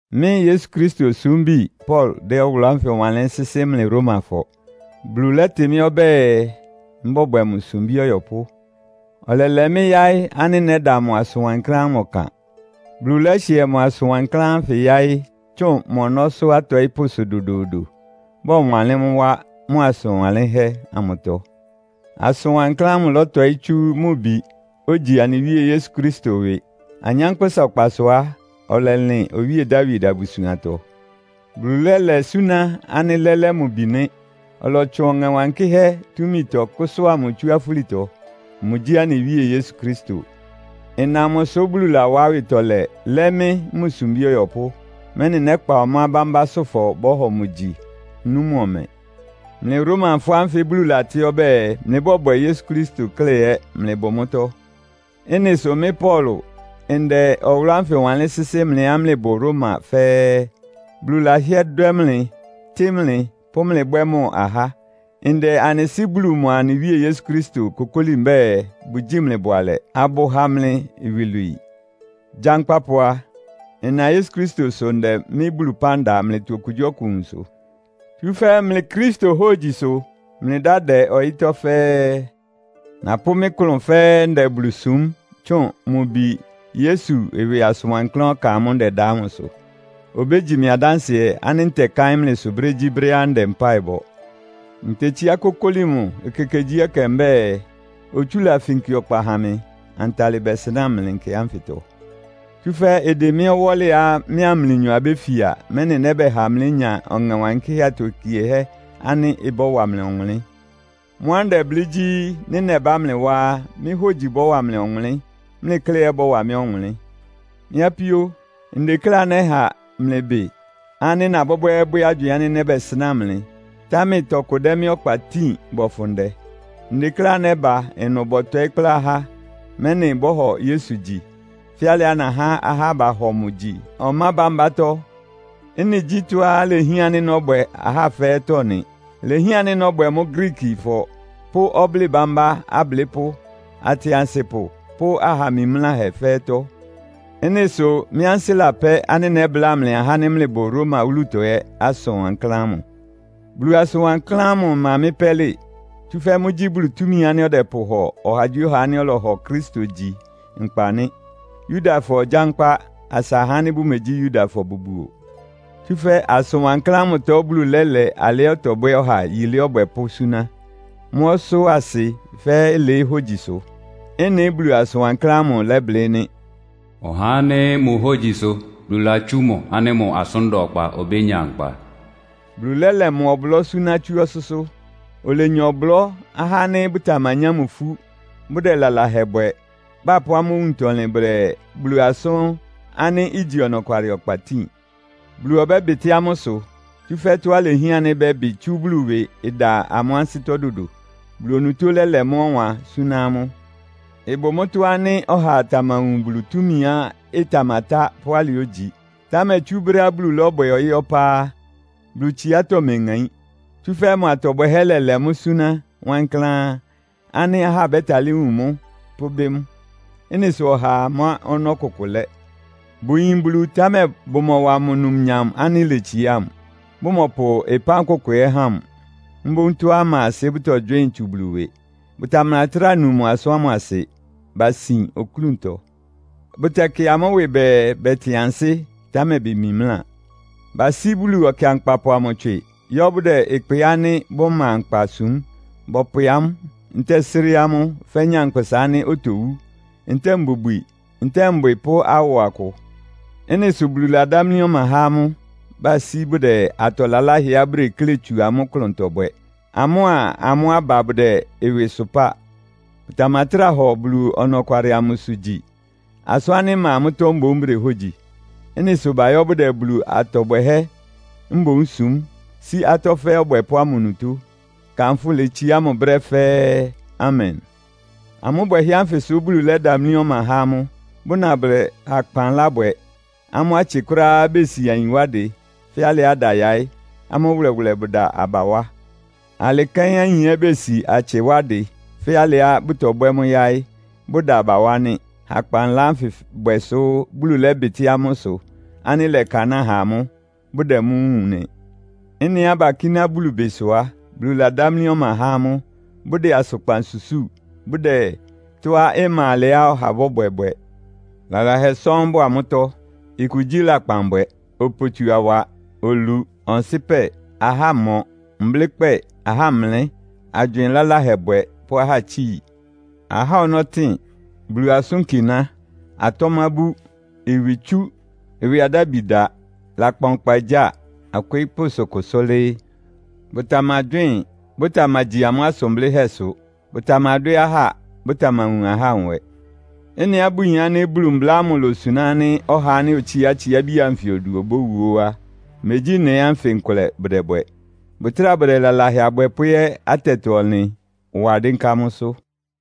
Mɩ́ Yesu Kristo osúmbi Paulo dɛ́ ɔwʋlʋ́ ánfɩ wanlɩ́n sɩ́sɩ́ mlɩ Romafɔ. Bulu lɛ́tɩ mɩ́ ɔbɛ́ɛ, mbɔ́bwɛ mʋ sumbí ɔyɔpʋ́. Ɔlɛlɛ mɩ́ yáɩ́ ánɩ́ nɛ́da mʋ asʋn wankláán ámʋ ɔkan. Bulu lɛ́hɩɛ asʋn wankláán ánfɩ yáɩ́ tsʋn mʋ ɔnɔ́sʋ́ atɔɩ́pʋ́sʋ dodoodo, bɔwanlɩ́n mʋ́ wá mʋ asʋn wanlɩ́nhɛ́ amʋtɔ. Asʋn wankláán ámʋ ɩlɔtɔɩ́ tsú mʋ Bi, ogyi anɩ Wíe Yesu Kristo ɩwɩ. Anyánkpʋ́sa ɔkpasʋ á, ɔlɛlɩn Owíe Dawid abusuantɔ. Bulu lɛ́lɛ súná ánɩ́ lɛ́lɛ́ mʋ Bi nɩ́. Ɔlɔtsʋn Ɔŋɛ Wankɩ́hɛ́ túmitɔ kʋ́sʋ́a mʋ tsú afúlitɔ. Mʋgyí anɩ Wíe Yesu Kristo. Ɩna mʋsʋ Bulu lawá awɩtɔlɛ lɛ́ mɩ́ mʋ sumbí ɔyɔpʋ́, mɛ́nɩ nɛ́kpa ɔmá bámbásʋ́fɔ bɔ́hɔ mʋ gyi, nú mʋ ɔmɛ. Mlɩ Romafɔ ánfɩ Bulu latɩ́ ɔbɛ́ɛ, mlɩbɔ́bwɛ Yesu Kristo klɛ́ ɛ́ mlɩbʋ mʋ́tɔ́. Ɩ́nɩ sʋ mɩ́ Paulo ndɛ ɔwʋlʋ́ ánfɩ wanlɩ́n sɩ́sɩ́ mlɩá mlɩbʋ Roma fɛ́ɛ́. Bulu lahɩ́ɛ́ dwɛ́ mlɩ, tɩ́ mlɩ, pʋ́ mlɩ bwɛ́ mʋ ahá. Ndɛ anɩ Sɩ́ Bulu mʋa anɩ Wíe Yesu Kristo kokóli mbɛ́ɛ, bʋgyíi mlɩ bʋalɛ, abʋha mlɩ iwilwii. Gyankpapʋ a, nna Yesu Kristosʋ ndɛ mɩ́ Bulu ɩpán da mlɩtɔ okugyíɔkʋ nwunsʋ. Tsúfɛ́ mlɩ Kristo hógyi sʋ mlɩ dá dɛ ɔyɩ́tɔ́ fɛ́ɛ́. Napʋ́ mɩ́ klʋn fɛ́ɛ́ ndɛ Bulu súm tsʋn mʋ Bi Yesu ɩwɩ asʋn wankláán ɔkan ámʋ́ʋ́ ndɛda ámʋsʋ. Obégyi mɩ adánsɩɛ ánɩ́ ntɛkáɩ́n mlɩsʋ brégyíbrɛ́á ndɛ mpáɩ bɔ. Ntetsíá kokóli mʋ ekekegyíɛkɛ mbɛ́ɛ, otsúla finki ɔkpa ha mɩ, antalɩ bɛsɩnáa mlɩ nkɛ ánfɩtɔ. Tsúfɛ́ ɩdɩn mɩ́ ɔwɔ́lɩá mɩ́a mlɩnyɔ abéfia, mɛ́nɩ nɛ́bɛha mlénya Ɔŋɛ Wankɩ́hɛ́ atokiehɛ́ ánɩ́ ɩbɔ́wa mlɩ ɔwʋnlɩ́n. Mʋ́á ndɛblɩ́ gyí, nɩ́ nɛbá mlɩ wá á, mɩ́ hógyi bɔ́wa mlɩ ɔwʋnlɩ́n, mlɩ klɛ́ ɛ́ ɩbɔ́wa mɩ́ ɔwʋnlɩ́n. Mɩ́ apíó, ndekléá nɛha mlɩ bɩ ánɩ́ nabwɛ́bwɛ́ɛ́bwɛ́ agywɩɩn ánɩ́ nɛ́bɛsɩnáa mlɩ, támɛ tɔkʋ dɛ mɩ́ ɔkpa tíin bɔfʋn ndɛ. Ndekléá nɛ́ba ɩnʋ bɔtɔɩ́ kplá ahá, mɛ́nɩ bɔ́hɔ Yesu gyi, fɛ́ alɩá nahá ahá bahɔ mʋ gyi ɔmá bámbátɔ́. Ɩ́nɩ gyí tɔ́á ilehián ánɩ́ nɔ́bwɛ ahá fɛ́ɛ́tɔ́ nɩ. Ilehián ánɩ́ nɔ́bwɛ mʋ́ Griikifɔ pʋ́ ɔblɩ́ɩ bámbá ablɩ́pʋ́, atɩansɩpʋ pʋ́ aha mimláhɛ fɛ́ɛ́tɔ́. Ɩ́nɩ sʋ mɩ́ ansɩ́ lapɛ́ ánɩ́ nɛ́bláa mlɩ ahá ánɩ́ mlɩbʋ Roma wúlutɔ ɛ́ asʋn wankláán ámʋ. Bulu asʋn wankláán ámʋ ɩma mɩ́ pɛ́lɩ. Tsúfɛ́ mʋ́gyí Bulu túmi ánɩ́ ɔdɛpʋhɔ ɔhagyíɔha ánɩ́ ɔlɔhɔ Kristo gyi nkpa nɩ́. Yudafɔ gyánkpá, asa ahá ánɩ́ bʋmegyí Yudafɔ bʋbuo. Tsúfɛ́ asʋn wankláán ámʋtɔ Bulu lɛ́lɛ alɩá ɔtɔbwɛ́ ɔha yilé ɔbwɛpʋ́ súná. Mʋ́ ɔsʋ́-asɩ fɛ́ɛ́ ɩlɩɩ́ hógyisʋ. Ɩ́nɩ Bulu asʋn wanlɩ́nhɛ́ amʋ lɛblɩ́ nɩ́. “Ɔhá ánɩ́ mʋ hógyi sʋ Bulu latsú mʋ ánɩ́ mʋ asʋ́n da ɔkpa obénya nkpa.” Bulu lɛ́lɛ mʋ ɔblɔ́ súná tsú ɔsʋ́sʋ́. Olenya ɔblɔ́ ahá ánɩ́ bʋtamanyá mʋ ifú, bʋdɛ lalahɛ bwɛ, bapʋ́ amʋ́ owuntɔlɩn bʋdɛ Bulu asʋ́n ánɩ́ igyi ɔnɔkwalɩ ɔkpa tíin. Bulu ɔbɛ́bɩtɩ́ amʋ́ ɩsʋ. Tsúfɛ́ tɔ́á ilehián ánɩ́ bɛ́bɩ tsú Bulu ɩwɩ ɩda amʋ́ ansɩ́tɔ́ dodo. Bulu onutó lɛ́lɛ mʋ́ ɔwan súná ámʋ. Ɩbʋ mʋ́tɔ́ ánɩ́ ɔhaa tamawun Bulu túmiá ɩtamatá pʋ́ alɩá ogyi. Támɛ tsú brɛ́á Bulu lɔ́bwɛ ɔyɩ́ ɔpá á, Bulu tsiátɔ́ meŋaín. Tsúfɛ́ mʋ atɔ bwɛhɛ́ lɛlɛ mʋ́ súná wankláán ánɩ́ ahá bɛ́talɩ́ wun mʋ́, pʋ́bɩ́ mʋ. Ɩ́nɩ sʋ ɔhaa má ɔnɔ́ kʋkʋ lɛ́. Bʋyin Bulu, támɛ bʋmɔwa mʋ numnyam ánɩ́ iletsiá mʋ, bʋmɔpʋ ɩpán kʋkʋ ɛ́ há mʋ. Mboún tɔ́á ɩma asɩ bʋ́tɔgywɩ́ɩn tsu Bulu ɩwɩ. Bʋtamatráa nu mʋ asʋ́n ámʋ asɩ. Basin oklúntɔ. Bʋtɛkɩ amʋ́ ɩwɩ bɛɛ bɛtɩn ansɩ́, támɛ bemimláa. Basí Bulu ɔkɩankpapʋ amʋ tswɩ, yɔ́ bʋdɛ ɩkpɩ ánɩ́ bʋma nkpa súm. Bɔpwɛ amʋ́, ntɛ́ɛ sré amʋ́ fɛ́ nyankpʋsa ánɩ́ otowú, ntɛ́ɛ mbubwi, ntɛ́ɛ mbwɩ pʋ́ awɔ akʋ. Ɩ́nɩ sʋ Bulu ladámlí ɔma há amʋ́, basí bʋdɛ atɔ laláhɛá bʋdeklé tsu amʋ́ klʋntɔ bwɛ, amʋ́a amʋ́ aba bʋdɛ ɩwɩ sʋpáa. Bʋtamatráa hɔ Bulu ɔnɔkwalɩ amʋsʋ gyi. Asʋ́n ánɩ́ ɩma mʋ́tɔ́ mboún bʋdehógyi. Ɩ́nɩ sʋ bayɔ́ bʋdɛ Bulu atɔ bwɛhɛ́ mboún súm, sí atɔ́ fɛ́ɛ́ Ɔbwɛpʋ́ ámʋ onutó. Kanfʋ́ letsiá mʋ brɛ́ fɛ́ɛ́! Amen. Amʋ́ bwɛhɛ́ ánfɩ sʋ Bulu lɛ́damlí ɔma há amʋ́, bʋna bʋdɛ hakpanla bwɛ. Amʋ́ atsɩ kʋ́ráá besi ayin wá dɩ, fɛ́ alɩá ɩda yaɩ́, amʋ́ wʋlɛwʋlɛ bʋda aba wá. Alɩ kɛ́n ayin ɛ́ besi atsɩ wá dɩ fɛ́ alɩá bʋtɔbwɛ́ mʋ́ yáɩ́, bʋda aba wá nɩ́. Hakpanla anfɩ bwɛ sʋ Bulu lɛ́bɩtɩ́ amʋ́ ɩsʋ ánɩ́ lɛkanáa ha amʋ́, bʋdɛ mʋ́ wúun nɩ. Ɩ́nɩá bakíná Bulu bɩ sʋ á, Bulu ladámlí ɔma há amʋ́, bʋdɛ asʋkpan susúu, bʋdɛ tɔ́á ɩma alɛá ɔha ɔbɔ́bwɛ bwɛ. Lalahɛ sɔ́ɔ́n bʋ amʋ́tɔ́. Ɩkʋ gyí; lakpanbwɛ, opotsuawa, olu, ɔnsɩ́pɛ, ahámɔ, mblɩ́kpɛ́ɛ, ahámlɛ́, agywɩɩn laláhɛ bwɛ pʋ́ ahátsíi. Ahá ɔnɔ́tɩn, Bulu asʋ́nkiná, atɔ́mábú, ɩwɩtsú, ɩwɩ adábi da. Lakpan ɔkpagyáa, akwɩɩ́pʋ́sʋ kʋsʋ́lɩ́ɩ́. Bʋtamagywɩ́ɩn, bʋtamagyi amʋ́ asʋn blɩ́hɛ́sʋ. Bʋtamadwɛ́ ahá, bʋtamawun ahá nwɛ. Ɩ́nɩá bʋyin ánɩ́ Bulu mbla ámʋ losuná ánɩ́ ɔhá ánɩ́ otsíá atsiábi anfɩ odu obówu óó á, megyí ɩ́nɩ ánfɩ nkʋlɛ bʋdɛbwɛ. Bʋtráa bʋdɛ lalahɛ abwɛpʋ́ ɛ́ atɛtɔ-ɔnlɩn wa dɩ́nká mʋ́sʋ́.